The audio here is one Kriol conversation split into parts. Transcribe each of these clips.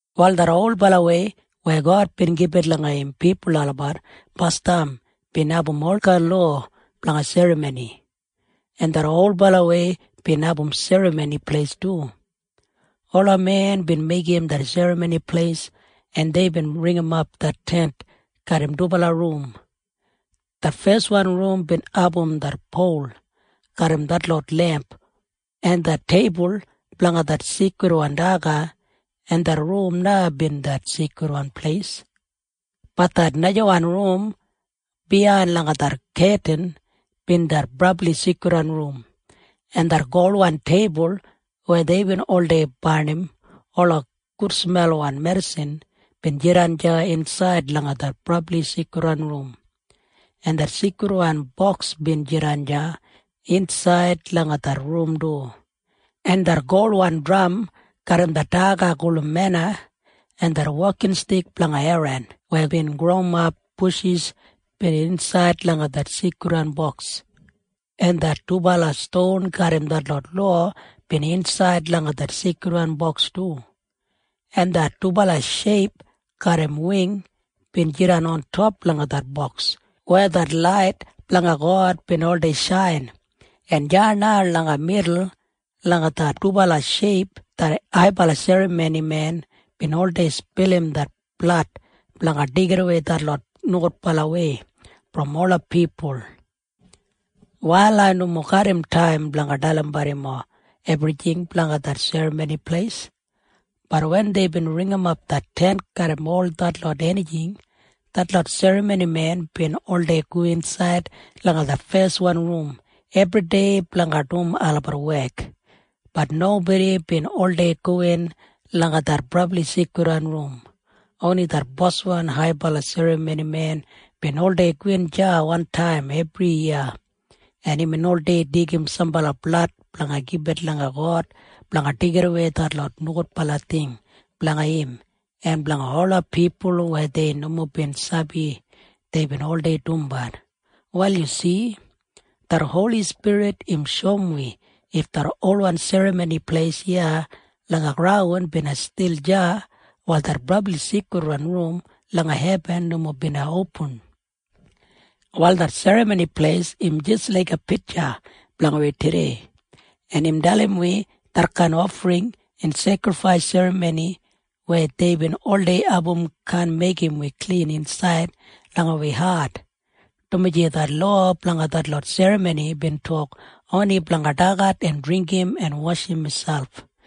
Wal det olbalawei weya God bin gibit langa im pipul olabat basdam bin abum olkain lowa blanga serramoni, en det olbalawei bin abum serramoni pleis du. Ola men bin meigim det serramoni pleis, en deibin ringimap det Tent garram dubala rum. Det feswan rum bin abum det pol garram detlot lemp en det teibul blanga det seikridwan daga, en det rum na bin det Seikridwan Pleis. Bat det najawan rum biyain langa det ketin bin det Brabli Seikridwan Rum, en det golwan teibul weya deibin oldei barnim ola gudsmelwan medisin bin jidan deya insaid langa det Brabli Seikridwan Rum, en det Seikridwan Boks bin jidan deya insaid langa det Rum du, en det golwan dram garram det daga gulum mena en det wokinstik blanga Eran weya bin growimap bushis bin insaid langa det Seikridwan Boks, en det dubala ston garram detlot lowa bin insaid langa det Seikridwan Boks du, en det dubala sheip garram wing bin jidan ontop langa det boks weya det lait blanga God bin oldei shain, en deya na langa midul langa det dubala sheip det haibala serramonimen bin oldei spilim det blad blanga deigidawei detlot nogudbalawei brom ola pipul. Wal ai nomo garram taim blanga dalimbat yumob ebrijing blanga det Serramoni Pleis. Bat wen deibin ringimap det Tent garram ol detlot enijing, detlot serramonimen bin oldei go insaid langa det feswan rum ebridei blanga dum olabat wek. Bat nobodi bin oldei gowin langa det Brabli Seikridwan Rum. Oni det boswan haibala serramonimen bin oldei gowin deya wantaim ebriyiya, en imbin oldei deigim sambala blad blanga gibit langa God blanga deigidawei detlot nogudbala ting blanga im en blanga ola pipul weya dei nomo bin sabi wanim deibin oldei dumbat. Wal yu si? Det Holi Spirit im shoum wi if det olwan Serramoni Pleis iya langa graun bina stil deya, wal det Brabli Seikridwan Rum langa hebin nomo bina opin. Wal det Serramoni Pleis im jis laiga pitja blanga wi tudei, en im dalim wi detkain ofring en sekrifais serramoni weya deibin oldei abum kaan meigim wi klin insaid langa wi hat, dumaji det lowa blanga detlot serramoni bin tok oni blanga dagat en dringgim en washim miselp.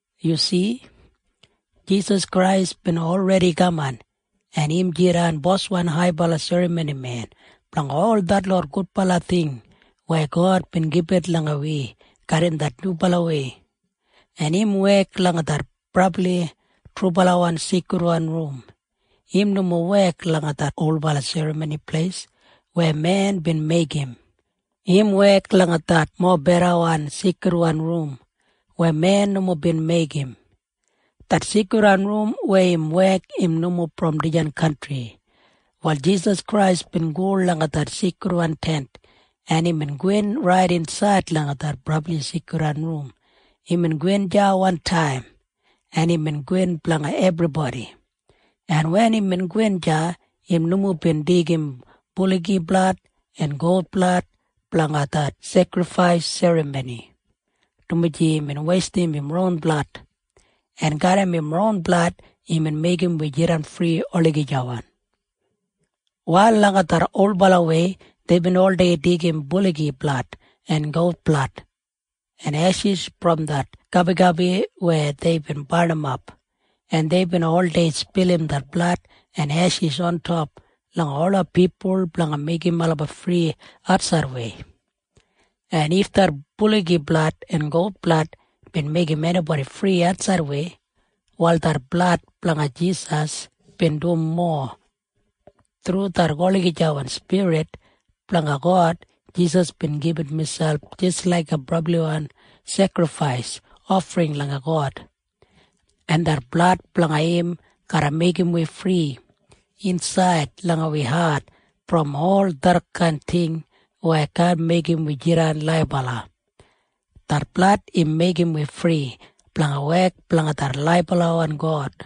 Yu si? Jisas Krais bin olredi kaman, en im jidan Boswan haibala serramonimen blanga ol detlot gudbala ting weya God bin gibit langa wi garram det nyubalawei, en im wek langa det brabli trubalawan seikridwan rum. Im nomo wek langa det olbala Serramoni Pleis weya men bin meigim. Im wek langa det mobedawan seikridwan rum weya men nomo bin meigim. Det seikridwan rum weya im wek im nomo brom dijan kantri. Wal Jisas Krais bin go langa det Seikridwan Tent, en imbin gowin rait insaid langa det Brabli Seikridwan Rum. Imbin gowin deya wantaim, en imbin gowin blanga ebribodi, en wen imbin gowin deya, im nomo bin deigim buligi blad en gout blad blanga det sekrifais serramoni, dumaji imbin weistim im ron blad, en garram im ron blad imbin meigim wi jidan fri olagijawan. Wal langa det olbalawei deibin oldei deigim buligi blad en gout blad en eshis brom det gabigabi weya deibin barnimap, en deibin oldei spilim det blad en eshis ontop langa ola pipul blanga meigim olabat fri atsaidwei. En if det buligi blad en gout blad bin meigim enibodi fri atsaidwei, wal det blad blanga Jisas bin dum mowa. Thru det olagijawan Spirit blanga God, Jisas bin gibit miselp jis laiga brabliwan sekrifais ofring langa God, en det blad blanga im garra meigim wi fri insaid langa wi hat brom ol detkain ting weya kaan meigim wi jidan laibala. Det blad im meigim wi fri blanga wek blanga det laibalawan God.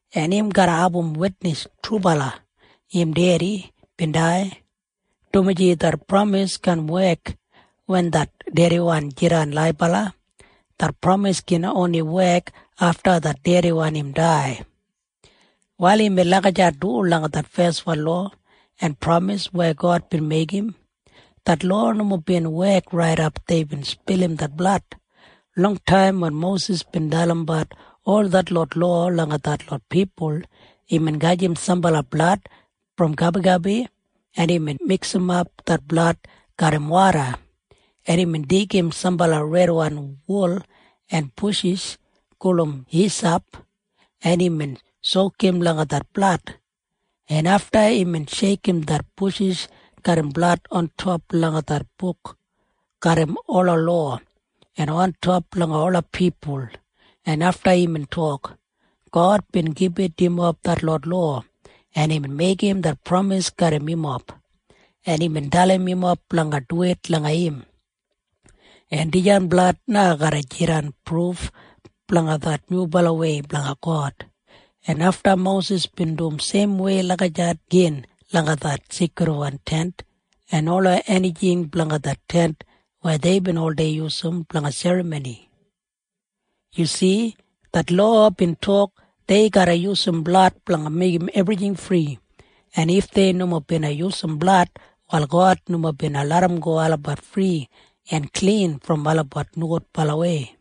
en im garra abum witnis trubala im dedi bin dai, dumaji det pramis kaan wek wen det dediwan jidan laibala. Det pramis gin oni wek afta det dediwan im dai. Wal imbin lagijat du langa det feswan lowa en pramis weya God bin meigim. Det lowa nomo bin wek raidap deibin spilim det blad. Longtaim wen Mosis bin dalimbat ol detlot lowa langa detlot pipul, imbin gajim sambala blad brom gabigabi, en imbin miksimap det blad garram woda, en imbin deigim sambala redwan wul en bushis gulum hisap, en imbin sokum langa det blad, en afta imbin sheikim det bushis garram blad ontop langa det buk garram ola lowa en ontop langa ola pipul, en afta imbin tok, “God bin gibit yumob detlot lowa, en imbin meigim det pramis garram yumob, en imbin dalim yumob blanga duwit langa im. En dijan blad na garra jidan pruf blanga det nyubalawei blanga God.” En afta Mosis bin dum seimwei lagijat gin langa det Seikridwan Tent en ola enijing blanga det Tent weya deibin oldei yusum blanga serramoni. Yu si? Det lowa bin tok dei garra yusum blad blanga meigim ebrijing fri, en if dei nomo bina yusum blad, wal God nomo bina larramgo olabat fri en klin brom olabat nogudbalawei.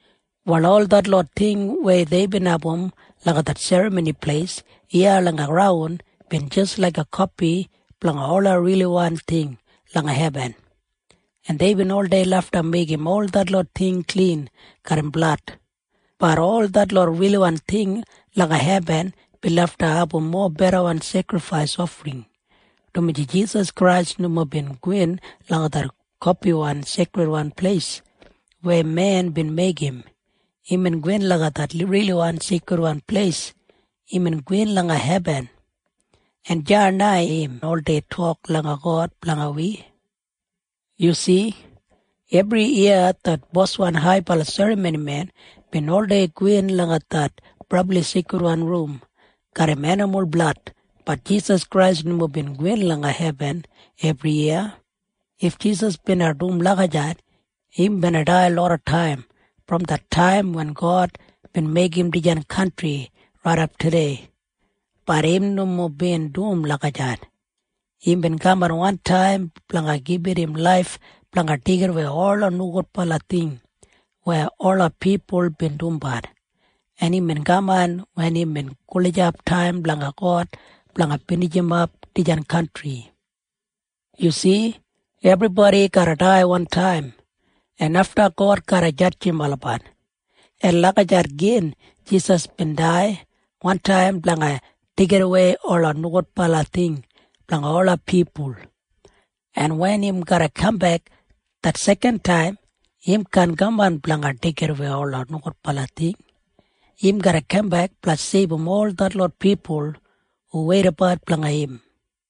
Wal ol detlot ting weya deibin abum langa det Serramoni Pleis iya langa graun bin jis laiga kopi blanga ola riliwan ting langa hebin, en deibin oldei lafta meigim ol detlot ting klin garram blad. Bat ol detlot riliwan ting langa hebin bin lafta abum mobedawan sekrifais ofring, dumaji Jisas Krais nomo bin gowin langa det kopiwan Seikridwan Pleis weya men bin meigim. Imbin gowin langa det riliwan Seikridwan Pleis. Imbin gowin langa hebin, en deya na im oldei tok langa God blanga wi. Yu si? Ebriyiya det boswan haibala serramonimen bin oldei gowin langa det Brabli Seikridwan Rum garram enimul blad. Bat Jisas Krais nomo bin gowin langa hebin ebriyiya. If Jisas bina dum lagijat, im bina dai lodataim brom det taim wen God bin meigim dijan kantri raidap tudei. Bat im nomo bin dum lagijat. Imbin kaman wantaim blanga gibit im laif blanga deigidawei ola nogudbala ting weya ola pipul bin dumbat, en imbin kaman wen imbin gulijap taim blanga God blanga binijimap dijan kantri. Yu si? Ebribodi garra dai wantaim, en afta God garra jadjim olabat. En lagijat gin Jisas bin dai wantaim blanga deigidawei ola nogudbala ting blanga ola pipul, en wen im garra kambek det sekantaim, im kaan kaman blanga deigidawei ola nogudbala ting. Im garra kambek blanga seibum ol detlot pipul hu weidabat blanga im.